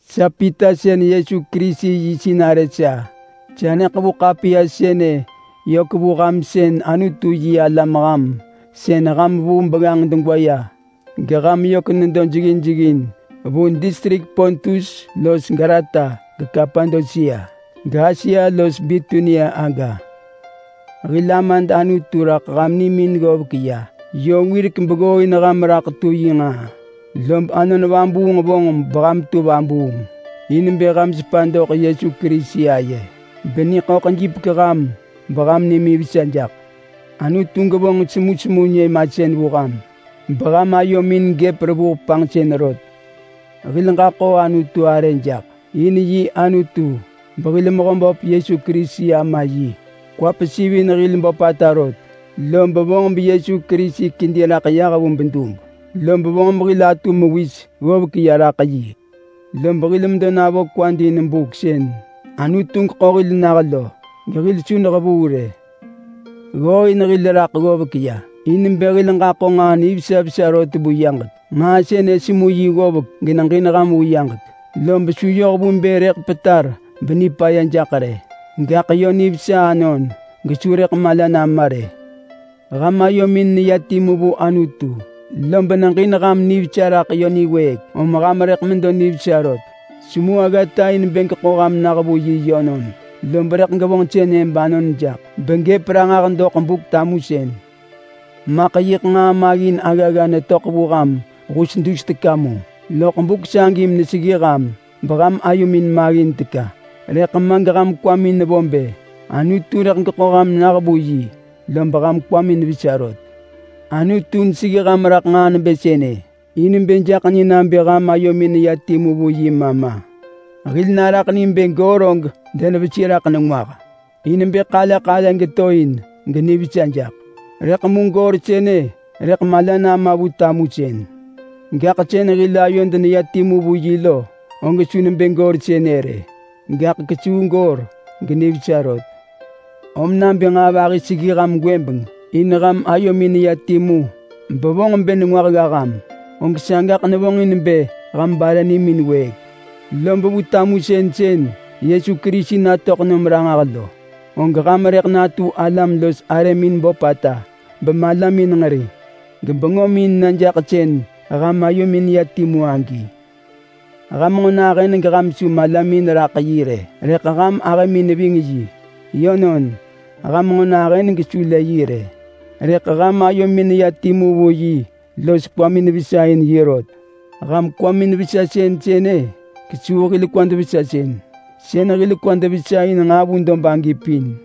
Sa Pita sën Yesu Kerisi yi sinarë sa. Sa neḳevu ḳapiya sënë yök vu ham sën Anutu-yi-alam ham, sën ham vuu begganġ degwa ya geham yök nedo jeggin jeggin vu distrik Pontus los Galata geKapadosia, gAsia los Bitunia aga. Hil Amad Anutu raḳ ham nimin ggovek ya yö wirek beggooin ham raḳ tu yi nġaa. Lob Anon Vabuung vonġ beham tu vabuung in bë ham sepa doḳ Yesu Kerisi aye beniḳöḳ jipek ham beham nimin vesa jaḳ. Anutu gevonġ semusemu nyëmasën vu ham rot beham ayomin gëp revuh panġsën rot. Hil ġaḳo Anutu arë jaḳ. In yi Anutu behil Mehöböp Yesu Kerisi Ama yi. Kwa pesiv in hil böpata rot, lob vonġ beYesu Kerisi kedi raḳ yah vu bedub, lob vonġ behil atu mewis ggovek ya raḳ yi. Lob hil medo navo kwad in buk sën Anutu geḳo hil nah lo gehil su nehevuu rë. Ggooin hil raḳ ggovek ya in bë hil ġaḳo nġaa nivesa vesa rot vu yaġek. Nġaa sënë semu yi ggovek geneġin ham vu yaġek. Lob su yoh vu bë rëḳ petar benipaya jaḳ rë, gaḳ yö nivesa anon gesu rëḳ mala nama rë. Ham ayomin neya timu vu Anutu, lob neġin ham nivesa raḳ yö niwëëk, om ham rëḳ medo nivesa rot. Semu aggata in bë geḳo ham nah vu yi yönon, lob rëḳ gevonġ sënë banon jaḳ begëp ranġah doḳ Buk-tamusën. Maḳ yiḳ nġaa maggin aggagga netöḳ vu ham hus dus teka mu loḳ buk sagi meneseggi ham beham ayomin maggin teka. Rëḳ ma geham kwamin nevo bë Anutu rëḳ geḳo ham nah vu yi, lob ham kwamin vesa rot. Anutu neseggi ham raḳ nġaa nebë sënë in bë jaḳ ni nabë ham ayomin neya timu vu yi ma ma. Hil araḳ ni bë goor og denevesi raḳ nengwah in bë ḳale ḳale geto in genivesa jaḳ, rëḳ mu goor sënë rëḳ mala nama vu tamusën. Gaḳ sën hil ayod neya timu vu yi lo, og su nebë goor sënë rë, gaḳ kesuu goor genivesa rot. Om nabë nġaa vahi seggi ham gwëbeng in ham ayomin neya timu bevonġ bë nengwah gga ham, og sagaḳ nevonġ in bë ham bare nimin week. Lob vu tamusën sën Yesu Kerisi natöḳ nom ranġah lo, og ham rëḳ natu alam los arëmin böpata bemalamin nġeri gebengömin na jaḳ sën ham ayomin ya timu agi. Ham nġo nahën geham su malamin raḳ yi rë, rëḳ ham ahëmin neving yi. Yönon, ham nġo nahën gesu lë yi rë, rëḳ ham ayomin neya timu vu yi los kwamin vesa in yi rot. Ham kwamin-vesa-sën sënë kesuu hil kwad-vesa-sën sën hil kwad vesa in nġaa vu dob agi pin.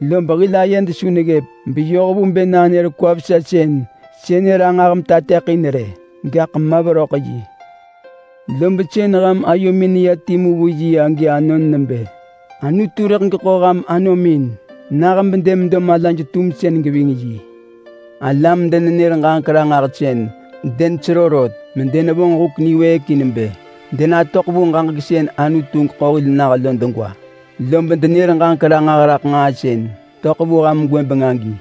Lob hil ayed su neggëp beyoh vu bë nanër kwa-vesa-sën sënë ranġah metateḳin rë, gaḳ ma veröḳ yi. Lob sën ham ayomin neya timu vu yi agi anon nebë: Anutu rëḳ geḳo ham anomin nah bedemedo malaj-tumsën geving yi. Alam-denenër-ġaġek-ranġahsën denesero rot medenevonġ huk niwëëk in bë denatöḳ vu ġaġek sën Anutu geḳo hil nah lo degwa, lob denër ġaġek ranġah raḳ nġaa sën töḳ vu ham gwëbeng agi.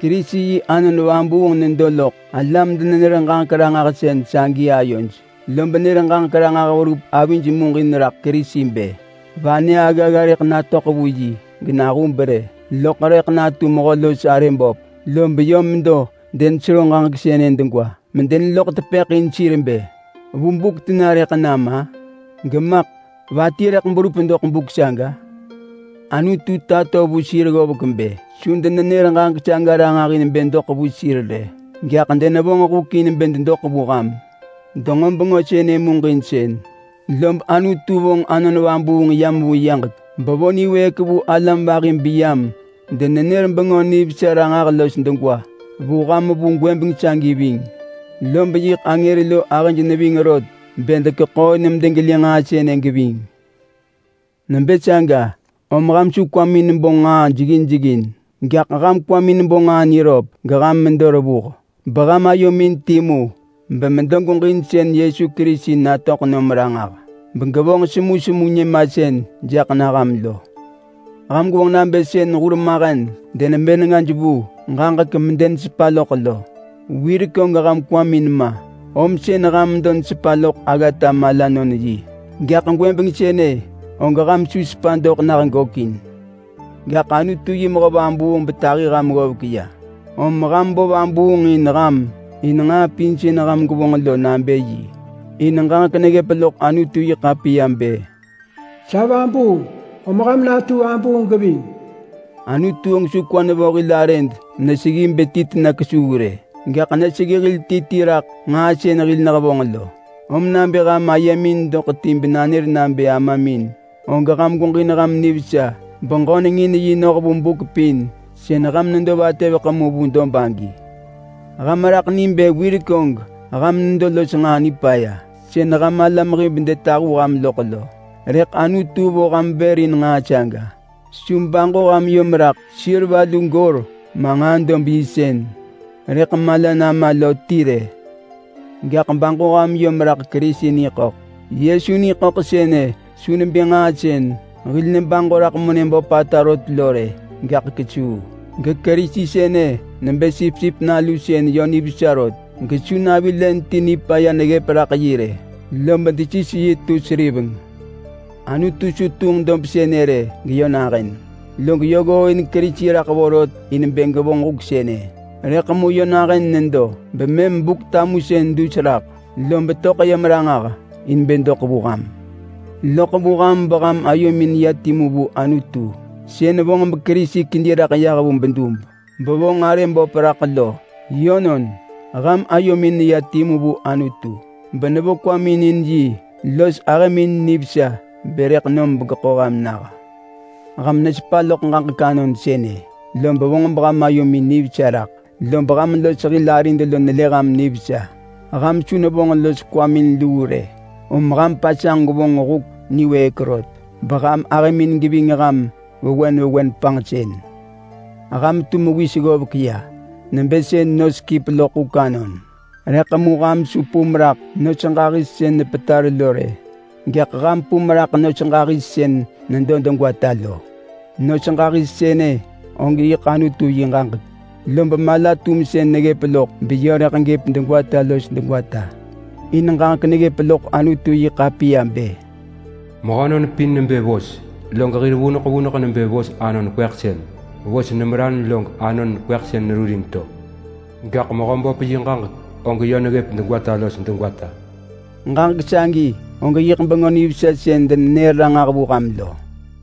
Kerisi yi Anon Vabuung nedo loḳ alam-denenër-ġaġek-ranġahsën sagi ayoj lob nër ġaġek ranġah verup avij muġin raḳ Kerisi bë: Vanë aggagga rëḳ natöḳ vu yi, genahub rë loḳ rëḳ natu mehö los arë böp. Lob yö medo denesero ġaġek sënë degwa medeneloḳ tepëḳ in sir bë, “Vu buk tena rëḳ nam-a?” Gemaḳ “Va ti rëḳ berup doḳ buk saga?” Anutu tato vu sir ggovek bë su denenër ġaġek saga ranġah in bë doḳ vu sir rë, gaḳ denevonġ huk in bë dedoḳ vu ham. Denġo bengö sënë muġinsën, lob Anutu vonġ Anon Vabuung yam vu yaġek bevo niwëëk vu alam vahi beyam denenër Bengö Nivesa ranġah los degwa vu ham vu gwëbeng sagi ving. Lob yiḳ angër lo ahëj neving rot bë dekeḳooin medegelë nġaa sënë geving. Nebë saga, om ham su kwamin bo nġaa jeggin jeggin, gaḳ ham kwamin bo nġaa niröp geham medo revuh. Beham ayomin timu bemedo gweġin sën Yesu Kerisi natöḳ nom ranġah begevonġ semusemu nyëmasën jaḳ na ham lo. Ham gwevonġ nabë sën hurmahen denebë nengaj vu ġaġek medenesepa loḳ lo. Wirek og ham kwamin ma, om sën ham medo nesepa loḳ aggata malanon-yi. Gaḳ gwëbeng sënë og ham su sepa doḳ nah gökin. Gaḳ Anutu yi mehö vabuung betahi ham ggovek ya, om ham bo vabuung in ham in nġaa pin sën ham gwevonġ lo nabë yi. In ġaġek neggëp loḳ Anutu-yi-ḳapiya bë, “Sa vabuung, om ham natu vabuung geving.” Anutu og su kwa nevo hil arëd meneseggi bë ti tena kesuu rë, gaḳ neseggi hil ti ti raḳ nġaa sën hil nehevonġ lo. Om nabë ham ayemin doḳ ti benanër nabë Amamin, og ham gweġin ham nivesa beġöneng in yi noh vu buk pin sën ham nedo vatëveḳ mu vu dob agi. Ham raḳ ni bë wirek og ham nedo los nġaa nipaya sën ham alam hib detahu ham loḳ lo, rëḳ Anutu vo ham vër in nġaa saga. Su baġo ham yom raḳ seriva lu goor ma nġaa-dob-yi sën rëḳ mala nama lo ti rë. Gaḳ baġo ham yom raḳ Kerisi ni ḳöḳ. Yesu ni ḳöḳ sënë su nebë nġaa sën hil nebaġo raḳ monë böpata rot lo rë, gaḳ kesuu. GeKerisi sënë nebë sipsip nalu sën yö nivesa rot gesu navi len ti nipaya neggëp raḳ yi rë, lob desis yi tu seriveng. Anutu su tunġ dob sënë rë geyö nahën, log yö ggooin Kerisi raḳ vorot in bë gevonġ huk sënë. Rëḳ mu yö nahën nedo bemëm Buk-tamusën dus raḳ, lob töḳ yam ranġah in bë doḳ vu ham. Loḳ vu ham beham ayomin ya timu vu Anutu sën vonġ beKerisi kedi raḳ yah vu bedub bevonġ arë böp raḳ lo. Yönon, ham ayomin neya timu vu Anutu benevo kwamin in yi los ahëmin nivesa bë rëḳ nom begeḳo ham nah. Ham nesepa loḳ ġaġek anon sënë, lob vonġ beham ayomin nivesa raḳ. Lob ham los hil arid lo nelë ham nivesa. Ham su nevonġ los kwamin luu rë, om ham pasanġ gwevonġ huk niwëëk rot beham ahëmin geving ham vewen vewen panġsën. Ham tu mewis ggovek ya nebë sën nos kip loḳ huk anon. Rëḳ mu ham su pum raḳ nos ġahis sën nepetar lo rë! Gaḳ ham pum raḳ nos ġahis sën nedo degwata lo. Nos ġahis sënë og yiḳ Anutu yi ġaġek, lob mala-tumsën neggëp loḳ beyö rëḳ gëp degwata los degwata. In ġaġek neggëp loḳ Anutu-yi-ḳapiya bë: “Mehönon pin nebë vos. Log hir vuneḳ vuneḳ nebë vos anon kweḳsën. Vos nemeran log anon kweḳsën nerurin to. Gaḳ Mehöböp yi ġaġek, og yö neggëp degwata los degwata.” Ġaġek sagi og yiḳ Bengö Nivesa sën denenër ranġah vu ham lo.